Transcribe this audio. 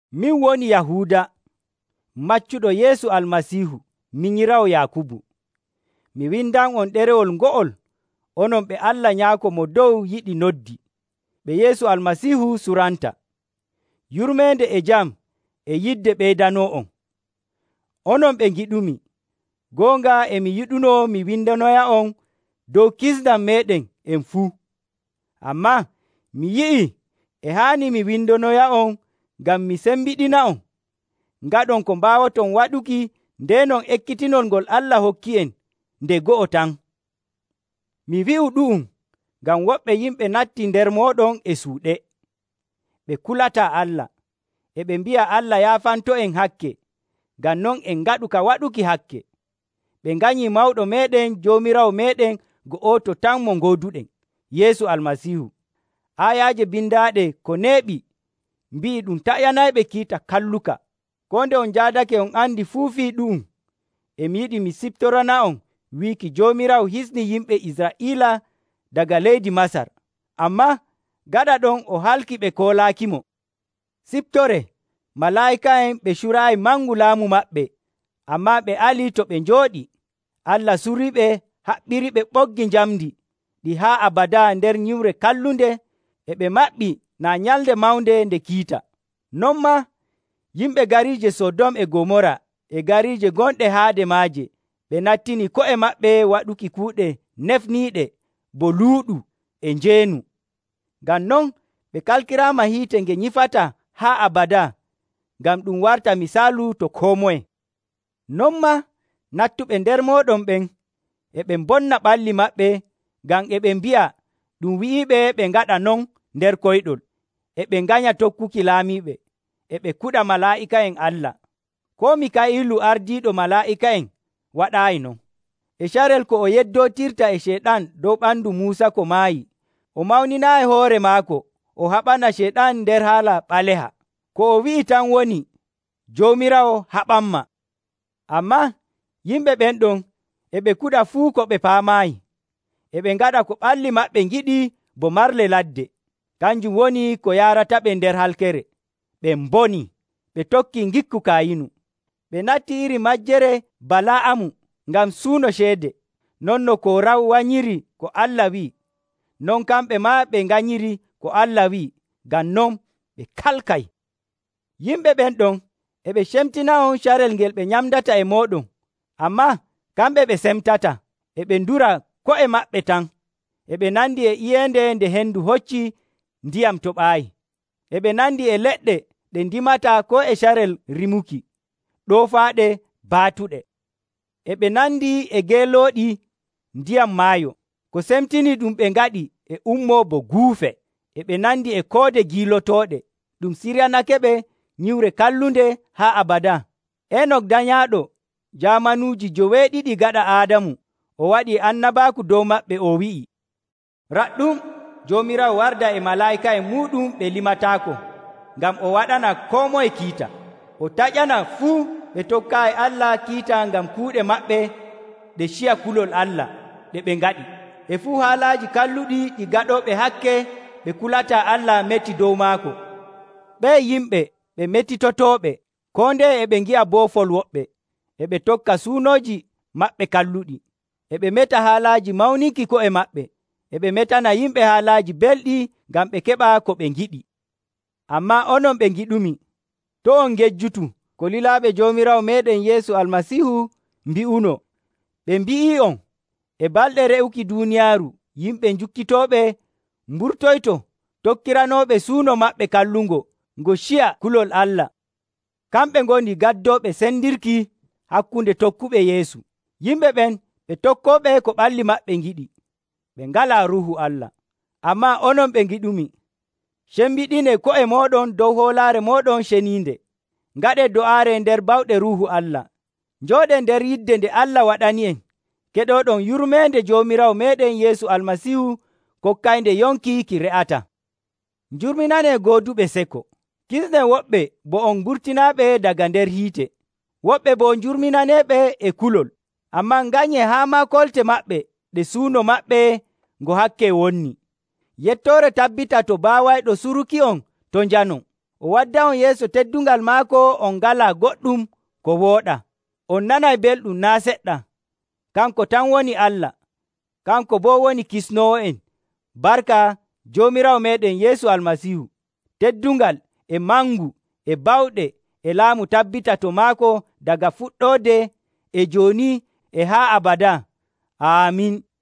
Min woni Yahuuda, maccuɗo Yeesu Almasiihu, minyiraawo Yaakubu. Mi windan'on ɗerewol ngo'ol, onon ɓe Allah Nyaako Mo Dow yiɗi noddi, ɓe Yeesu Almasiihu suranta. Yurmeende e jam e yidde ɓeydanoo'on. Onon ɓe ngiɗumi, goonga e mi yiɗunoo mi windonoya'on dow kisndam meeɗen en fuu. Ammaa mi yi'ii e haani mi windonoya'on ngam mi sembiɗina'on ngaɗon ko mbaawoton waɗuki ndeenon ekkitinol ngol Allah hokki'en nde go'o tan. Mi wi'u ɗu'um ngam woɓɓe yimɓe nattii nder mooɗon e suuɗe. Ɓe kulataa Allah, e ɓe mbi'a Allah yaafanto'en hakke, ngam non en ngaɗu ka waɗuki hakke. Ɓe nganyii Mawɗo meeɗen Joomiraawo meeɗen go'oto tan mo ngooduɗen, Yeesu Almasiihu. Aayaaje bindaaɗe ko neeɓi mbi'i ɗum taƴanayɓe kiita kalluka. Koo nde on njaadake on andi fuu fii ɗu'um, e mi yiɗi mi siftorana'on wiiki Joomiraawo hisnii yimɓe Israa'iila daga leydi Masar. Ammaa gaɗa ɗon o halkii ɓe koolaakimo. Ciftoree malaa'ika'en ɓe curaayi mangu laamu maɓɓe, ammaa ɓe ali to ɓe njooɗii. Allah suriiɓe haɓɓiriɓe ɓoggi njamndi ɗi haa abadaa nder nyiwre kallunde e ɓe maɓɓii naa Nyalnde mawnde nde kiita. Non maa, yimɓe gariije Sodom e Gomoora e gariije gonɗe haade maaje ɓe nattini ko'e maɓɓe waɗuki kuuɗe nefniiɗe bo luuɗu e njeenu. Ngam non ɓe kalkiraama hiite nge nyifataa haa abadaa ngam ɗum warta misaalu to koo moye. Non maa, nattuɓe nder mooɗon ɓen e ɓe mbonna ɓalli maɓɓe ngam e ɓe mbi'a ɗum wi'iiɓe ɓe ngaɗa non nder koyɗol. E ɓe nganya tokkuki laamiiɓe, e ɓe kuɗa malaa'ika'en Allah. Koo Miikaa'ilu ardiiɗo malaa'ika'en waɗaayi non. E carel ko o yeddootirta e Ceyɗan dow ɓandu Muusa ko maayi, o mawninaayi hoore maako o haɓana Ceyɗan nder haala ɓaleha. Ko o wi'i tan woni, “Joomiraawo haɓanmaa!” Ammaa yimɓe ɓen ɗon e ɓe kuɗa fuu ko ɓe paamaayi. E ɓe ngaɗa ko ɓalli maɓɓe ngiɗi bo marle ladde. Kanjum woni ko yaarataɓe nder halkere. Ɓe mbonii! Ɓe tokkii ngikku Kayinu. Ɓe nattii iri majjere Bala'amu ngam suuno ceede. Non no Koora wanyiri ko Allah wi'i, non kamɓe maa ɓe nganyiri ko Allah wi'i. Ngam non, ɓe kalkay. Yimɓe ɓen ɗon e ɓe cemtina'on carel ngel ɓe nyamdata e mooɗon ammaa kamɓe ɓe semtataa, e ɓe ndura ko'e maɓɓe tan. E ɓe nandi e iyeende nde hendu hocci ndiyam toɓaayi. E ɓe nandi e leɗɗe ɗe ndimataa koo e carel rimuki, ɗoofaaɗe, baatuɗe. E ɓe nandi e geelooɗi ndiyam maayo, ko semtinii ɗum ɓe ngaɗi e ummoo bo guufe. E ɓe nandi e koode giilotooɗe, ɗum siryanakeɓe nyiwre kallunde haa abadaa. Enok danyaaɗo jaamanuuji joweeɗiɗi gaɗa Aadamu, o waɗii annabaaku dow maɓɓe, o wi'ii, “Raɗɗum, Joomiraawo warday e malaa'ika'en muuɗum ɓe limataako, ngam o waɗana koo moye kiita. O taƴana fuu ɓe tokkaayi Allah kiita ngam kuuɗe maɓɓe ɗe ciya kulol Allah ɗe ɓe ngaɗi, e fuu haalaaji kalluɗi ɗi gaɗooɓe hakke ɓe kulataa Allah meti dow maako.” Ɓe'e yimɓe ɓe metitotooɓe, koo ndeye e ɓe ngi'a boofol woɓɓe. E ɓe tokka suunooji maɓɓe kalluɗi. E ɓe meta haalaaji mawninki ko'e maɓɓe, e ɓe metana yimɓe haalaaji belɗi ngam ɓe keɓa ko ɓe ngiɗi. Ammaa onon ɓe ngiɗumi, to' on ngejjutu ko lilaaɓe Joomiraawo meeɗen Yeesu Almasiihu mbi'unoo. Ɓe mbi'ii'on, “E balɗe re'uki duuniyaaru yimɓe jukkitooɓe mburtoyto, tokkiranooɓe suuno maɓɓe kallungo ngo ciya kulol Allah.” Kamɓe ngoni gaddooɓe sendirki hakkunde tokkuɓe Yeesu. Yimɓe ɓen ɓe tokkooɓe ko ɓalli maɓɓe ngiɗi. Ɓe ngalaa Ruuhu Allah. Ammaa onon ɓe ngiɗumi, cembiɗinee ko'e mooɗon dow hoolaare mooɗon ceniinde. Ngaɗee do'aare nder bawɗe Ruuhu Allah. Njooɗee nder yidde nde Allah waɗani'en, keɗooɗon yurmeende Joomiraawo meeɗen Yeesu Almasiihu kokkaynde yonki ki re'ataa. Njurminanee gooduɓe seko. Kisnee woɓɓe bo on mburtinaɓe daga nder hiite. Woɓɓe boo njurminaneeɓe e kulol. Ammaa nganyee haa maa kolte maɓɓe ɗe suuno maɓɓe ngo hakke wonni. Yettoore tabbita to baawayɗo suruki'on to' njanon, o wadda'on yeeso teddungal maako on ngalaa goɗɗum ko wooɗaa, on nanay belɗum naa' seɗɗa. Kanko tan woni Allah, kanko boo woni Kisnoowo'en barka Joomiraawo meeɗen Yeesu Almasiihu. Teddungal, e mangu, e bawɗe, e laamu tabbita to maako daga fuɗɗoode e jooni e haa abadaa! Aamin.